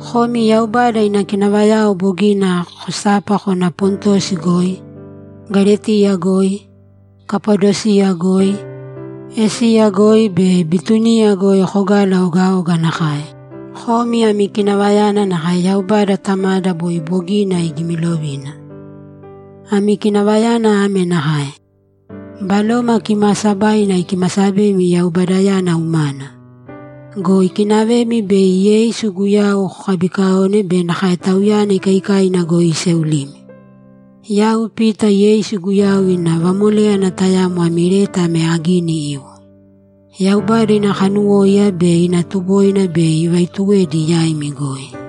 Komi Yaubada ina kinavayao bogina kosapa kona Pontosi goi, Galetiya goi, Kapadosiya goi, Esiya goi be Bituniya goi kogala ogaoga nakae, Komi ami kinavayana nakae Yaubada Tamada boi bogina igimilovina. Ami kinavayana ame nakae: Baloma Kimaasabaina ikimasabemi Yaubadayana umana. Go ikinavemi bei Yeisu Guyau kokabikaone be nakae Tauyana ikaikaina goi iseulimi. Yau Pita Yeisu Guyau ina vamoléyana tayamo ami leta ame agini iwo. Yaubada ina kanuwóiya be ina tuboina bei ivaituwedi yaimi goi.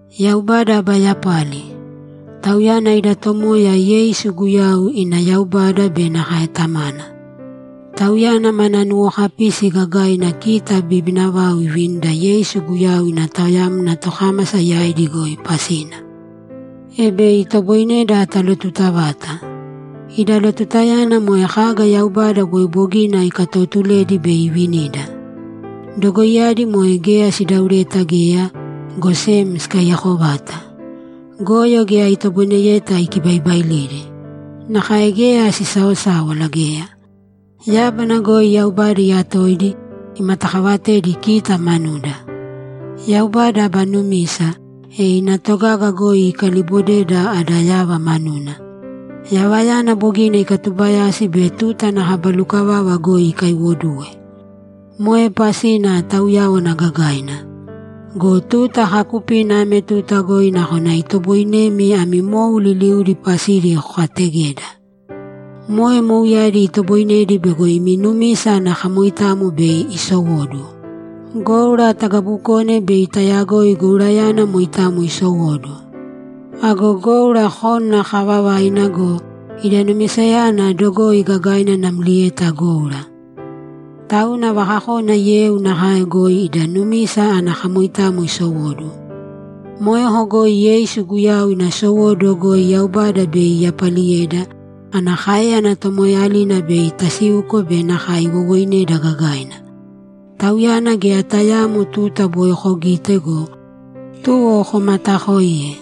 Yaubada aba yapali! Tauyana ida Tomoya Yeisu Guyau ina Yaubada be nakae Tamana. Tauyana mana nuwokapisi gagaina kita bibina vau ivinida Yeisu Guyau ina taoyamna tokámasa yaidi goi pasina, e bei itoboineda talotuta vata. Ida lotutayana moe kaga Yaubada boi bogina ikatootuledi bei ivinida. Dogoiyadi moe geya sidaureta geya, go sem sikaiyako vata. Goyo geya itoboineyeta ikibaibailidi. Nakae geya sisaosáwala geya. Yábana goi Yaubada iyatoidi, imatakaavatedi kita manuda. Yaubada aba numisa, e ina togaga goi ikaliibodeda ada yava manuna; yavayana bogina ikatubayasi be tuta ana kaba lukavava goi ikaiwoduwe. Moe pasina tauyáwana gagaina. Go tuta kaakupina ame tuta goi nakona itoboinemi ami mou liliudi pasidi kokaategeda. Moe mouyadi itoboinedi bego imi numisa ana kamoitamo bei isowóduwo. Goura tagabukone bei tayagoi gourayana moitamo isowóduwo. Ago goura kónana kaavavaina go, ida numisayana dogoi gagaina namlieta goura. Tauna vakakona yeu nakae goi ida numisa ana kamoitamo isowóduwo. Moeko goi Yeisu Guyau ina sowóduwo goi Yaubada bei iyapaliyeda, ana káeyana tomoeeyalina bei tasiuko be nakae iwowoineda gagaina. Tauyana geya tayaamo tuta boi kogite go, tuwo komataakoiye.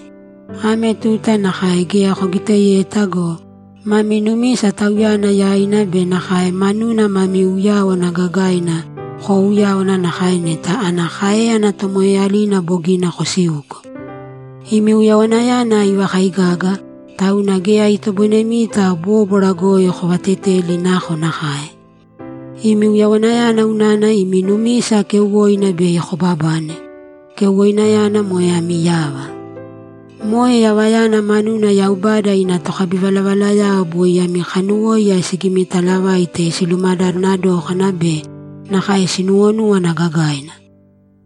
Ame tuta nakae geya kogiteyeta go, mami numisa Tauyana yaina be nakae manuna mami uyáwana gagaina koouyáwana nakae neta ana káeyana tomoeeyalina bogina kosiuko! Imi uyawanayana ivakaigaga, tauna geya itoboinemita bóbwara goi kovateteli nakonakae. Imi uyawanayana unana imi numisa keuwoina bei kobabane; keuwoinayana moe ami yava. Moe yavayana manuna Yaubada ina tokabivalavalayao boi ami kanuwóiya sigimitaalavaite silumadadana dókana be nakae sinuwonúwana gagaina.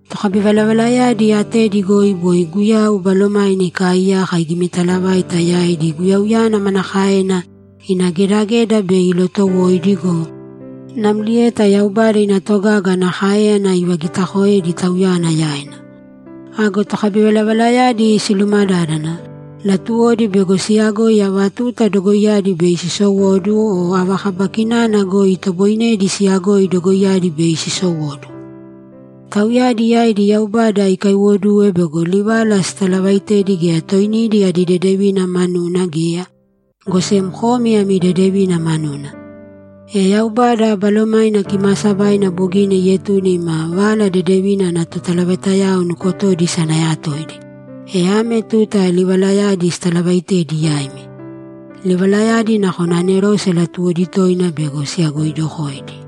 Tokabivalavalayadi atedi goi boi Guyau Balomaina ikaaiyaka igimitalavaita yaidi Guyauyana manakaena ina gedageda bei ilotowoidi go, namlieta Yaubada ina togaga ana káeyana ivagitakoedi Tauyana yaina. Ago tokabivalavalayadi silumadádana, latuwodi bego siyagoi ava tuta dogoiyadi bei sisowóduwo o ava kaba kinana goi itoboinedi siyagoi dogoiyadi bei sisowóduwo. Tauyadi yaidi Yaubada ikaiwoduwe bego livala sitalavaaitedi geya toinidi adi dedevina manuna geya, go sem komi ami dedevina manuna. E Yaubada Balomaina Kimaasabaina bogina ietune ima Vala Dedevina ana totalavaitayao nukotodi isanayatoidi, e ame tuta livalayadi sitalavaaitedi yaimi. Livalayadi nakona anerose latuwodi toina bego siyagoidokoidi.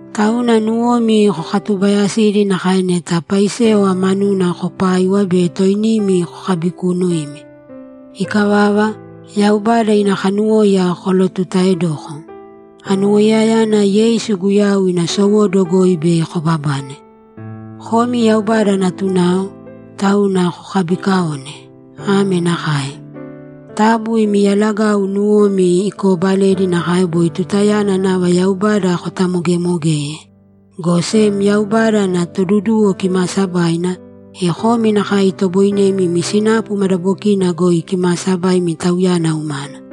Tauna nuwomi kokatubaayasīdi nakae neta paisewa manuna kopaiwa be toinimi kokabikuunuīmi. Ikavava, Yaubada ina kanuwóiya kolotutaedōko. Anuwoiyayana Yeisu Guyau ina sowóduwo goi bei kobabane. Komi Yaubada natunao, tauna kokabiikaōne. Ame nakae: Taabu imi yalagau nuwomi ikoobalēdi nakae boi tutayana nava Yaubada kotamogeemogeye, go sem Yaubada ada Toduduwo kimaasabaina, e komi nakae itoboinemi imi sinapu madabokina goi kimaasabaimi Tauyana umana.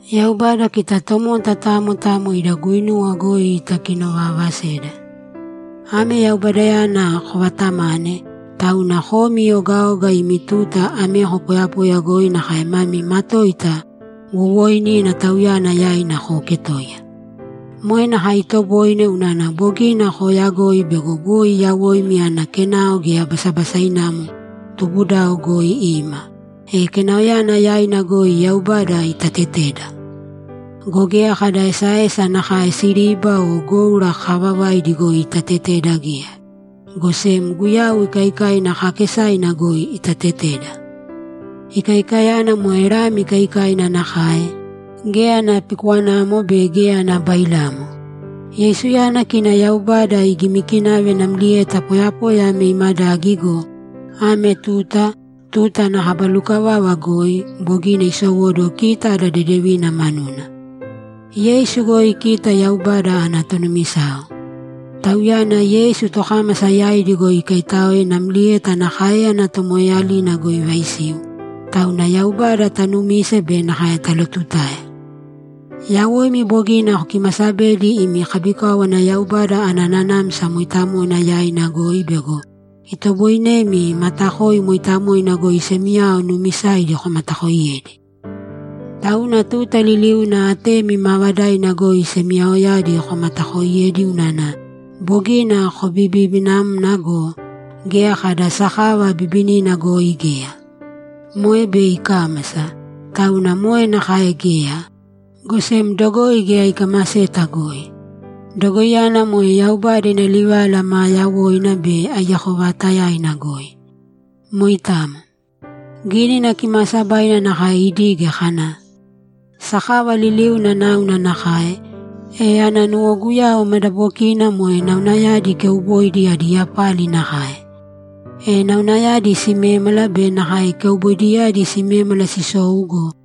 Yaubada kita tomota tamo tamo ida guinuwa goi itakinovaavaseda. Ame Yaubadayana kovaatamane, tauna komi ogaoga imi tuta ameko poyapoya goi nakae mami matoita wowooinina Tauyana yaina kooketōiya. Moe nakae itoboine unana bogina kooyagoi bego boi yawoimi ana kenao geya basabasainamo tubudao goi ima, e kenaoyana yaina goi Yaubada itateteda. Go geya kada esaesa nakae siriba o goura kaavavaidi goi itateteda geya, go sem Guyau ikaikaina kaakesaina goi itateteda. Ikaikayana moe lami ikaikaina nakae, geya ana pikwanamo be geya ana bailamo. Yeisuyana kina Yaubada igimikinave namlieta poyapoya ame imadagi go, ame tuta, tuta ana kaba lukavava goi, bogina isowóduwo kita ada dedevina manuna. Yeisu goi kita Yaubada ana tonumisao. Tauyana Yeisu tokámasa yaidi goi ikaitáoe namlieta ana káeyana tomoeeyalina goi ivaisiu, tauna Yaubada taanumise be nakae talootutae. Yawoimi bogina kokimasabedi imi kabikáwana Yaubada ana Nanamsa Mooitamoina yaina goi bego itoboinemi matakoi mooitamoina goi semiyao nuumisaidi komatakooiyedi. Tauna tuta liliuna atemi maavadaina goi semiyaoyadi komatakooiyēdi unana bogina kobibinamna go, geya kada sakava bibinina goi geya. Moe bei ikámasa, tauna moe nakae geya, go sem dogoi geya ikamaseta goi. Dogoiyana moe Yaubada ina livala maa yawoina be aiyako vaatayaina goi. Moitamo. Gínina Kimaasabaina nakae idige kana, ‘Sakava liliuna náuna nakae, e ana nuwoguyau madabokina moe naunayadi keuboidi adi yapali nakae. E naunayadi simémala be nakae keuboidiyadi simémala sisou go,